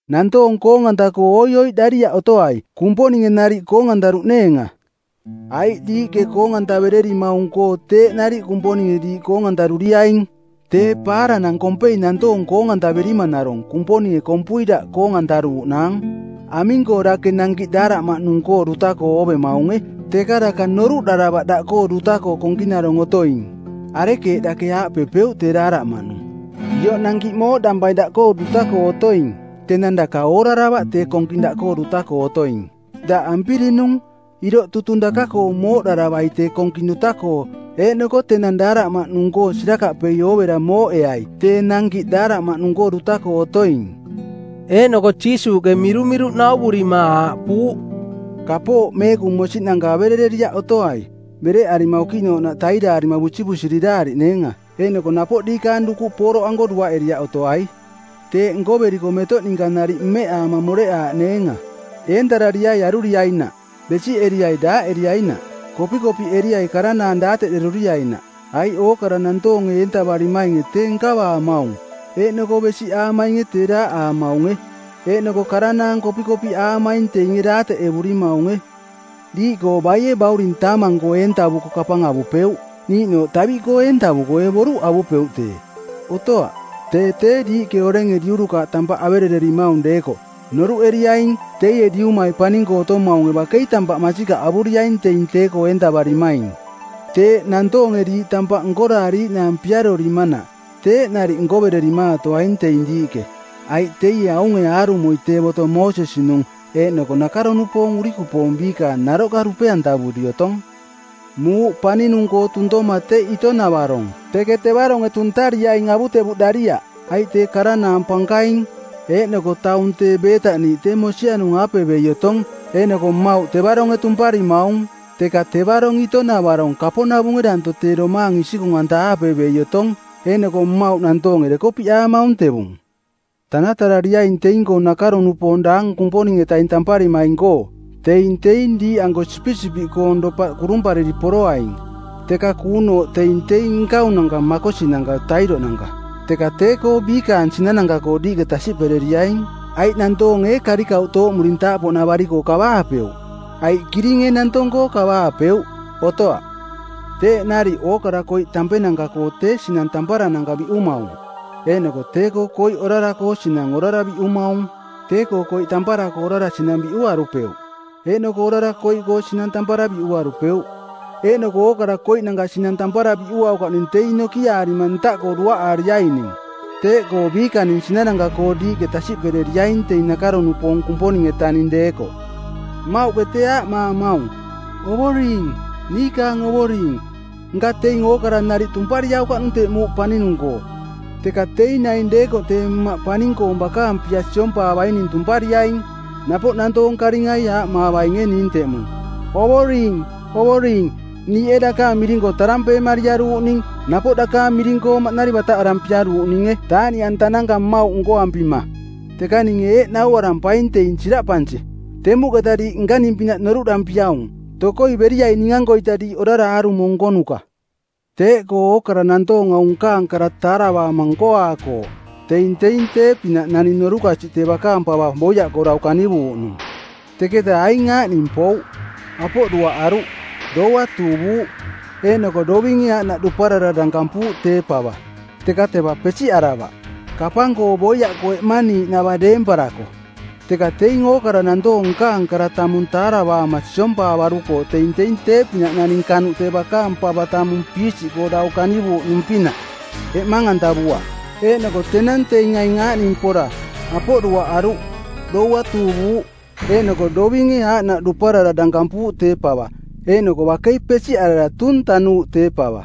“Nantoong koong-anta-koo oioiꞌdariaꞌ otoai Kumponinge nariꞌ koong-antaruꞌneenga. Aiꞌ diiꞌke koong-antavererimaung-koo teeꞌ nariꞌ Kumponinge diiꞌ koong-antaruriaing. Tee paaranang kompei nantoong koong-antaverimanarong Kumponinge kompui daꞌ koong-antaruuꞌnaang. Aming-koo dake nankiꞌ daaraꞌmaꞌnung-koo duta-koo oovemaunge teka daka noruꞌdaravaꞌ daꞌkoo duta-koo konkinarong otoing? Arekeeꞌ dake aaꞌpepeuꞌ tee daaraꞌmaꞌnung, ‘Ioꞌ nankiꞌ mooꞌdampai daꞌkoo duta-koo otoing,’ tenang daka ooraravaꞌ tee konking daꞌkoo duta-koo otoing. Daꞌ ampirinung˜, iroꞌ tutung daka-koo mooꞌdaravaing tee konking duta-koo eeꞌnoko tenang daaraꞌmaꞌnung-koo sirakaꞌpei oovera mooꞌeai tee nankiꞌ daaraꞌmaꞌnung-koo duta-koo otoing.” Eeꞌnoko Jiisuuꞌke mirumiruꞌ nauvurima aaꞌpuuꞌ, “Kapooꞌ meekung mosiꞌnanka averereriaꞌ otoai bereꞌarima okiꞌnooꞌnaꞌ tairaarima busivusiriraariꞌneenga. Eeꞌnoko napoꞌ diikaang dukuꞌ pooroꞌanko duaꞌeriaꞌ otoai. Teeꞌ nkoveriko metoꞌ ninka nariꞌ meeꞌaama moreꞌaaꞌneenga.” “Eentarariai aruriainaꞌ. Besiꞌeriai daaꞌeriainaꞌ. Kopikopiꞌeriai karanaang daateꞌderuriainaꞌ. Aiꞌ ookara nantoonge eentavarimainge tee nkavaamaung, eeꞌnoko besiꞌaamainge tee daaꞌaamaunge, eeꞌnoko karanaang kopikopiꞌaamaing teinge daateꞌevurimaunge. Diiꞌkoo baie bauring taamang-koo eentavuko kapang avupeuꞌ? Niiꞌnooꞌ taviꞌkoo eentavuko ee boruꞌ avupeuꞌ tee? Otoaꞌ. Tee tee diiꞌke orenge diurukaaꞌ tampaꞌ averererimaung deekoꞌ noruꞌeriaing teie Diumai paning-koo otomaunge bakei tampaꞌ masikaꞌ avuriaing teing tee-koo eentavarimaing. Teeꞌ nantoonge diiꞌ tampaꞌ nkoraariiꞌnaang piarorimanaꞌ teeꞌ nariꞌ nkovererimaatoaing teing diiꞌke, aiꞌ teie aunge aarumoi tee boto Moosesi-nung eeꞌnoko nakaro-nupoong urikupoong biikaang naroꞌka dupeantavuri otong.” “Muuꞌ paninung-koo tuntoma teꞌ ito-navarong. Teke tevaronge tuntariaing avutevuꞌdariaꞌ, aiꞌ tee karanaang pankaing, eeꞌnoko taung tee beetaꞌniiꞌ tee mosianung-aape bei otong, eeꞌnoko mmauꞌ tevaronge tumparimaung. Teka tevarong ito-navarong kaponavunge danto tee domaang isikung-anta-aape bei otong, eeꞌnoko mmauꞌ nantoonge dekopiꞌaamaung tevung.” “Tanatarariaing teing-koo nakaro-nupoong daang Kumponing-etaning tamparimaing-koo. Teing teing diiꞌanko sipisipiꞌkoong dopaꞌ kurumpariri poroaing, teka kuunooꞌ teing teing nkaunanka makosi-nanka tairoꞌnanka. Teka tee-koo biikaang sinananka-koo diiꞌke tasiꞌpereriaing. Aiꞌ nantoonge ee karikauꞌ tooꞌmurintaaꞌpoꞌnavari-koo kavaapeuꞌ? Aiꞌ kiring ee nantong-koo kavaapeuꞌ? Otoaꞌ! Teeꞌ nariꞌ ookara koiꞌ tampenanka-koo tee sinang tamparananka biꞌumaung. Eeꞌnoko tee-koo koiꞌ orara-koo sinang orara biꞌumaung. Tee-koo koiꞌ tampara-koo orara sinang biꞌuarupeuꞌ, eeꞌnoko orara koiꞌkoo sinang tampara biꞌuarupeuꞌ. Eeꞌnoko ookara koiꞌnanka sinang tampara biꞌuaukaꞌning teing nokiaarima ntaꞌkoo duaꞌaariaining. Teeꞌkoo biikaning sinananka-koo diiꞌke tasiꞌpereriaing teing nakaro-nupoong Kumponing-etaning deekoꞌ. “Mmauꞌke tee aaꞌmaamaung, ‘Ovoring, niikaang Ovoring,’ nka teing ookara nariꞌ tumpariaukaꞌnung teꞌ muuꞌ paninung-koo, teka teing naing deekoꞌ tee Mmaꞌ paning-koong bakaang pia siompaavaining tumpariaing. Napoꞌ nantoong karingai aaꞌmaavainge ning teꞌmung, ‘Ovoring, Ovoring, niiꞌ ee dakaang miring-koo tarampeemariaruuꞌning˜ napoꞌ dakaang miring-koo maꞌnari bataꞌarampiaruuꞌninge taaꞌniꞌantananka mmauꞌ nkoampima?’ Teka ninge eeꞌ nauarampaing teing siraꞌpansi, ‘Temuꞌketa diiꞌ nkaning pinaꞌ noruꞌdampiaung. Tokoi beriai ning-ankoita diiꞌ orara aarumo nkonuka.’” “Teeꞌkoo ookara nantoong aung nkaang kara taaravaama nkoaakooꞌ teing teing tee-pinaꞌ naning norukasiꞌ tee bakaang pava boiaꞌkoo dau kanivuuꞌnung. Teketa aing aaꞌning pouꞌ: apoꞌ duaꞌaruꞌ, doua tuuvuuꞌ, eeꞌnoko dovinge aaꞌnaꞌ duparara dankampuuꞌ tee pava, teka teva pesiꞌaravaꞌ, kapang-koo boiaꞌkoo eꞌmaniiꞌnava deemparako. Teka teing ookara nantoong nkaang kara tamung taaravaama siompaavarukooꞌ teing teing tee-pinaꞌ naning kanuꞌ tee bakaang pava tamung piisiꞌkoo dau kanivuuꞌnung-pinaꞌ, eꞌmang-antavuaꞌ. Eeꞌnoko tenang teing aing aaꞌning pora apoꞌ duaꞌaruꞌ, doua tuuvuuꞌ, eeꞌnoko dovinge aaꞌnaꞌ duparara dankampuuꞌ tee pava, eeꞌnoko bakei pesiꞌarara tuung tanuuꞌ tee pava.”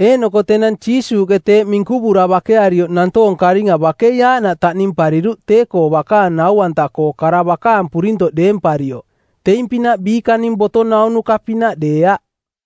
Eeꞌnoko tenang Jiisuuꞌke teeꞌ minkuvura bakearioꞌ nantoong karinga bakei aaꞌnaꞌ taꞌnimpariruꞌ tee-koo bakaang nau-anta-koo kara bakaang purintoꞌ deemparioꞌ, teing-pinaꞌ biikaning boto naunuka-pinaꞌ deeaꞌ.